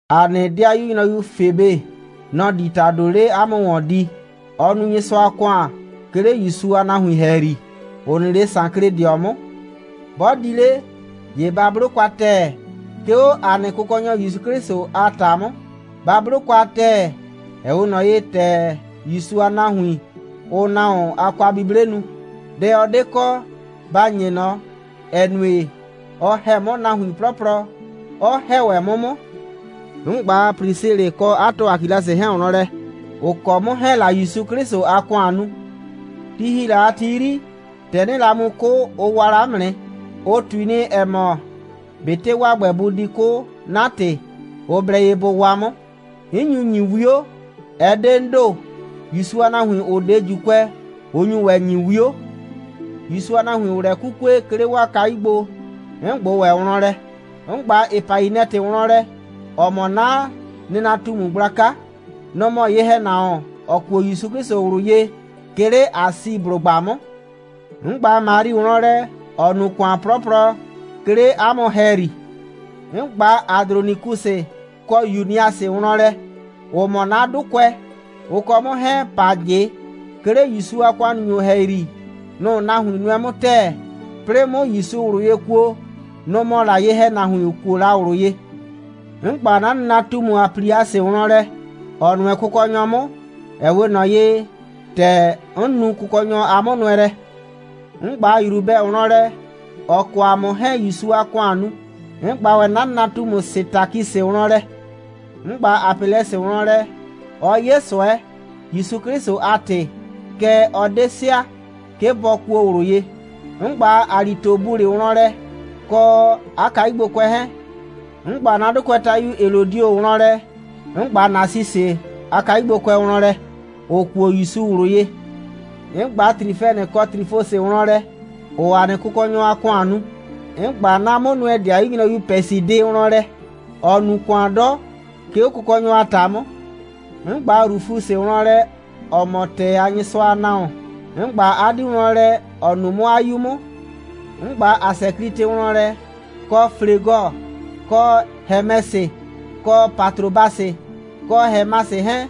‑A nɩ ‑dɩayu nyrɔyu Febe, nɔ‑ di ‑tado 'le 'a mʋ ‑wɔn di. Ɔɔ nu Nyɩsʋa a ‑kʋan, 'ke 'le ‑Yusu a nahuin ‑hɛyri, ‑ʋ nɩ 'le Sankledɩɔ 'mʋ. 'Bɔ di 'le, ‑ye ba 'blo kwa ‑tɛɛ, 'ke 'o ‑a nɩ Kʋkɔnyɔ ‑Yusu 'Klɩsʋ a ‑ta 'mʋ. Ba 'blo kwa ‑tɛɛ, ‑ɛ 'we ꞊nɔ ye, ‑tɛ ‑Yusu a nahuin, ʋʋ nahuon a kwa'buble nu. Dɛ ɔ 'de kɔ, ba ‑nye ꞊nɔ, ‑ɛ nue, ɔ ‑hɛ 'mʋ nahuin 'plɔplɔ, 'ɔ ‑hɛ ‑wɛ 'mʋ 'mʋ. 'N ꞊gba Prisilɩ kɔ 'a tɔ Akilasɩ 'hɛɛn wlɔn lɛ, ‑ʋ kɔ 'mʋ 'hɛɛn‑ la ‑Yusu 'Klɩsʋ a ‑kʋan nu. Ti ‑hi la a ti 'yri, ‑tɛ 'nɩɩ la mu 'kʋ, ʋ waa la 'mʋ nɩ. Ʋ ꞊tui nɩ, ‑ɛ mɔ, ꞊betɩ 'waa ‑gbɛ bʋ di 'kʋ 'na ‑tɩ, ʋ blɛ ye bʋ waa 'mʋ. 'N nyu ‑nyi 'wio. Ɛ 'de 'n ‑do. ‑Yusu a nahuin, ‑ʋ 'de ‑Juukʋɛ, ʋ nyu ‑wɛ ‑nyi 'wio. ‑Yusu a nahuin, ‑ʋʋ lɛ 'kukue, 'ke 'le 'waa kayu gbo, 'n ꞊gbʋ ‑wɛ wlɔn lɛ. 'N ꞊gba Epainɛtɩ wlɔn lɛ, ‑ɔ mɔ 'na nɩnatumu gblaka. Nɔ‑ mɔ ye‑hɛnahuon, ‑ɔ kuo ‑Yusu 'Klɩsʋ ꞊wlʋ ye, 'ke 'le Asiblʋgba 'mʋ. 'N ꞊gba Mari wlɔn lɛ, ‑ɔ nu ‑kʋan 'plɔplɔ, 'ke 'le 'a mʋ ‑hɛyri. 'N ꞊gba Adronikusɩ kɔ Yuniasɩ wlɔn lɛ, ‑ʋ mɔ 'na 'dʋkʋɛ. Ʋ kɔ 'mʋ 'hɛɛn‑ pa ꞊jɩ. 'Ke 'le ‑Yusu a ‑wɔnnaanyʋ ‑hɛyri, nʋ‑ nahuin nʋɛ 'mʋ ‑tɛɛ. 'Plɩɩ 'mʋ ‑Yusu ꞊wlʋ ye kuo, nʋ‑ mɔ la ye‑hɛnahuin, ‑ʋ kuo la ꞊wlʋ ye. 'N ꞊gba 'na nɩnatumu Apliasɩ wlɔn lɛ, ‑ɔ nʋɛ Kʋkɔnyɔ 'mʋ, ‑ɛ 'we ꞊nɔ ye, ‑tɛ 'n nu Kʋkɔnyɔ a 'mʋnʋɛlɛ. 'N ꞊gba Yrubɛ wlɔn lɛ. Ɔ kɔ ‑a mʋ 'hɛɛn‑ ‑Yusu a ‑kʋan nu. 'N ꞊gba ‑wɛ 'na nɩnatumu Sɩtakisɩ wlɔn lɛ. 'N ꞊gba Apɛlɛsɩ wlɔn lɛ. Ɔ 'ye ꞊sʋɛ, ‑Yusu 'Klɩsʋ a ‑tɩ. Kɛɛ, ɔ 'de sɩa, 'ke bɔ kuo ꞊wlʋ ye. 'N ꞊gba Alitobulɩ wlɔn lɛ, kɔ 'a kayugbokʋɛ 'hɛɛn. 'N ꞊gba 'na 'dʋkʋɛtayu Helodio wlɔn lɛ. 'N ꞊gba Nasisɩ a kayugbokʋɛ wlɔn lɛ, ‑ʋ kuo ‑Yusu ꞊wlʋ ye. 'N ꞊gba Trifɛnɩ kɔ Trifɔsɩ wlɔn lɛ, ‑ʋʋ ‑a nɩ Kʋkɔnyɔ a ‑kʋan nu. 'N ꞊gba 'na 'mʋnʋɛ‑dɩayu nyrɔyu Pɛsidɩ wlɔn lɛ, ‑ɔ nu ‑kʋan 'dɔ, 'ke 'o Kʋkɔnyɔ a ‑ta 'mʋ. 'N ꞊gba Rufusɩ wlɔn lɛ, ‑ɔ mɔ ‑tɛɛ a Nyɩsʋa a nahuon. 'N ꞊gba 'a 'dii wlɔn lɛ, ‑ɔ nuu 'mʋ 'a 'yu 'mʋ. 'N ꞊gba Asɛklitɩ wlɔn lɛ, kɔ Flegɔ, kɔ Hɛmɛsɩ, kɔ Patrobasɩ, kɔ Hɛmasɩ 'hɛɛn,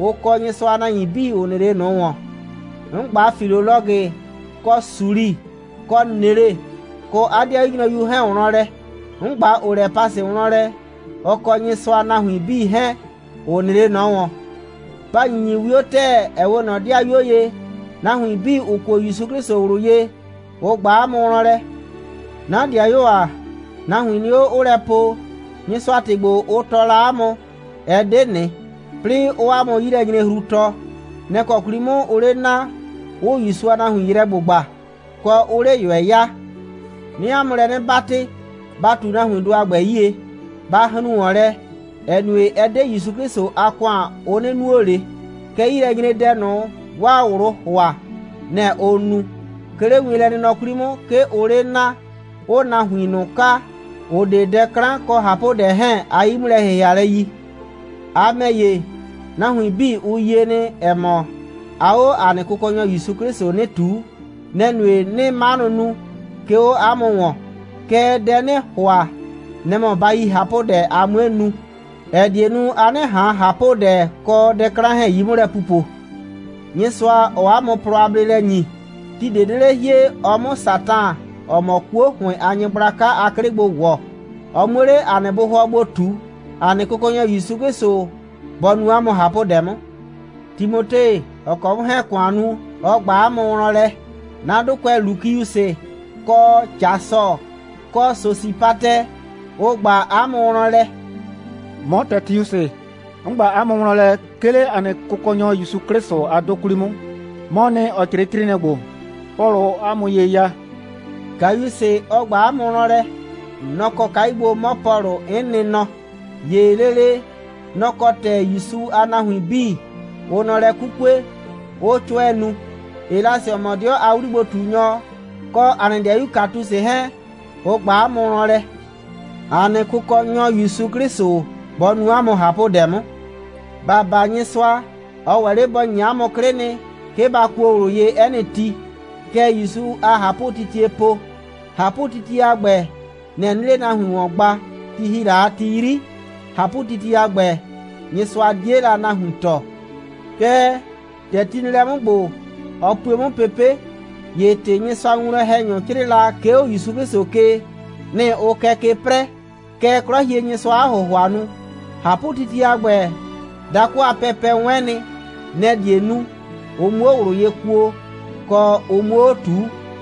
ʋ kɔ Nyɩsʋa a nahuin 'bii, ‑ʋ nɩ 'le ꞊nʋ ‑wɔn. 'N ꞊gba Filolɔgɩ, kɔ Suli, kɔ Nele, kɔ 'a 'dɩayu nyrɔyu 'hɛɛn wlɔn lɛ. 'N ꞊gba Olɛpasɩ wlɔn lɛ, ɔ kɔ Nyɩsʋa a nahuin 'bii 'hɛɛn, ‑ʋ nɩ 'le ꞊nɔ ‑wɔn. Ba ‑nyinyi 'wio ‑tɛɛ, ‑ɛ 'we ꞊nɔ ‑dɩayuo ye. Nahuin 'bii, ‑ʋ kuo ‑Yusu 'Klɩsʋ ꞊wlʋ ye, ʋ ꞊gba 'a mʋ wlɔn lɛ. 'Na ‑dɩayuo ‑a, nahuin nɩ 'o, 'ʋʋ lɛ po, Nyɩsʋa a ‑tɩ ‑gbo, ʋ tɔɔ la 'a mʋ, ɛ 'de ꞊nɩ, 'plɩɩ 'ʋʋ 'a mʋ 'yilɛnyrehru tɔɔ. Nɛ‑ kɔ 'kwli 'mʋ ʋʋ 'le naa, 'ʋʋ ‑Yusu a nahuin yrɛ ‑gbʋgba, kɔ, 'ʋʋ 'le ꞊yʋɛ ya. 'Nɩɩ 'a mʋ lɛ 'nɩ 'batɩ, ba ꞊tu nahuindʋ a ‑gbɛ 'yie. Ba hrun ‑wɔn lɛ, ‑ɛ nue, ɛ 'de ‑Yusu 'Klɩsʋ a ‑kʋan, ʋ 'nɩ nuo ꞊le, kɛɛ, 'yilɛnyredɛ ꞊nʋ, 'waa ꞊wlʋʋ ‑hʋa, nɛ‑ ʋʋ nu. 'Ke 'le wienlɛnɩnɔ 'kwli 'mʋ, 'ke ʋʋ 'le naa, 'ʋʋ nahuin ꞊nʋ kaa, ‑ʋ 'de dɛ 'klan kɔ ꞊hapʋdɛ 'hɛɛn a 'yi'mʋlɛ‑hɩhɩalɛ yi. A ‑mɛ ‑ye, nahuin 'bii, ʋ yie nɩ, ‑ɛ mɔ, aa 'o ‑a nɩ Kʋkɔnyɔ ‑Yusu 'Klɩsʋ 'nɩ ꞊tuu. Nɛ‑ nue, 'nɩɩ 'manʋ nu, 'ke 'o 'a mʋ ‑wɔn. Kɛɛ, dɛ 'nɩɩ ‑hʋa, nɛ‑ mɔ, ba yi ꞊hapʋdɛ, a 'mue nu, ‑ɛ die nu, a 'nɩ ꞊han ꞊hapʋdɛ kɔ dɛ 'klan 'hɛɛn 'yi 'mʋ lɛ pupo. Nyɩsʋa, ‑ɔɔ 'a mʋ plɔ a bleelɛ ‑nyi, ti ꞊de 'de 'le hie, ɔ 'mʋ Satan, ‑ɔ mɔ 'kuo ‑hʋɩn a nyɩgblaka a 'klɩ gbo ‑wɔ, ɔ 'muo 'le 'a nɩ bʋhʋɔ gbo ꞊tu. ‑A nɩ Kʋkɔnyɔ ‑Yusu 'Klɩsʋ bɔ nu 'a mʋ ꞊hapʋdɛ 'mʋ. Timote, ‑ɔ kɔ 'mʋ 'hɛɛn‑ ‑kʋan nu, ɔ ꞊gba 'a mʋ wlɔn lɛ. 'Na 'dʋkʋɛ, Lukiusɩ kɔ Jasɔ, kɔ Sosipatɛ, ʋ ꞊gba 'a mʋ wlɔn lɛ. 'Mɔ Tɛtiusɩ, 'n ꞊gba 'a mʋ wlɔn lɛ, 'ke 'le ‑a nɩ Kʋkɔnyɔ ‑Yusu 'Klɩsʋ a 'dʋ 'kwli 'mʋ. 'Mɔɔ nɩ, ‑ɔ 'crɩɩ 'crɩɩnɩɛ ‑gbo, Pɔlʋʋ 'a mʋ ye ya. Gayusɩ, ɔ ꞊gba 'a mʋ wlɔn lɛ. Nɔ‑ kɔ kayu gbo 'mɔ Pɔlʋ, 'n nɩ nɔ, ‑ye lele, nɔ‑ kɔ ‑tɛ ‑Yusu a nahuin 'bii, ʋʋ nɔ lɛ 'kukue, 'ʋʋ 'cʋɛ nu. Elasɩ, ‑ɔ mɔ 'dɩɔ a 'wligbo꞊tunyɔ, kɔ ‑a nɩ ‑dɩayu Katusɩ 'hɛɛn, ʋ ꞊gba 'a mʋ wlɔn lɛ. [ ‑A nɩ Kʋkɔnyɔ ‑Yusu 'Klɩsʋ bɔ nu 'a mʋ ꞊hapʋdɛ 'mʋ.] ‑Ba baa Nyɩsʋa. Ɔ ‑wɛ 'le bɔ ‑nyi 'a mʋ 'klɩ nɩ, 'ke ba kuo ꞊wlʋ ye 'ɛ nɩ ti. Kɛ ‑Yusu a ꞊hapʋtitiee po. ꞊Hapʋtitie a ‑gbɛ, nɛ‑ 'nɩɩ 'le nahuin ‑wɔn gba. Ti ‑hi la a ti 'yri, ꞊hapʋtitie a ‑gbɛ, Nyɩsʋa 'die la nahuin tɔɔ. Kɛɛ, ‑tɛ ti nɩ lɛ 'mʋ ‑gbo, ɔ pue 'mʋ pepe'. ‑Ye ‑tɩ Nyɩsʋa a winwlɔn‑hɛnyʋ 'crɩɩ la, 'ke 'o ‑Yusu 'Klɩsʋ ke, nɩ‑ ʋʋ kɛ ke 'prɛɛ. Kɛ 'Klɔhienyɩsʋaa 'a ‑hʋhʋa nu. ꞊Hapʋtitie a ‑gbɛ, dakʋ a pɛpɛ 'wɛn nɩ. Nɛ‑ die nu, ʋ 'muo ꞊wlʋ ye kuo, kɔ, ʋ 'muo 'o ꞊tuu.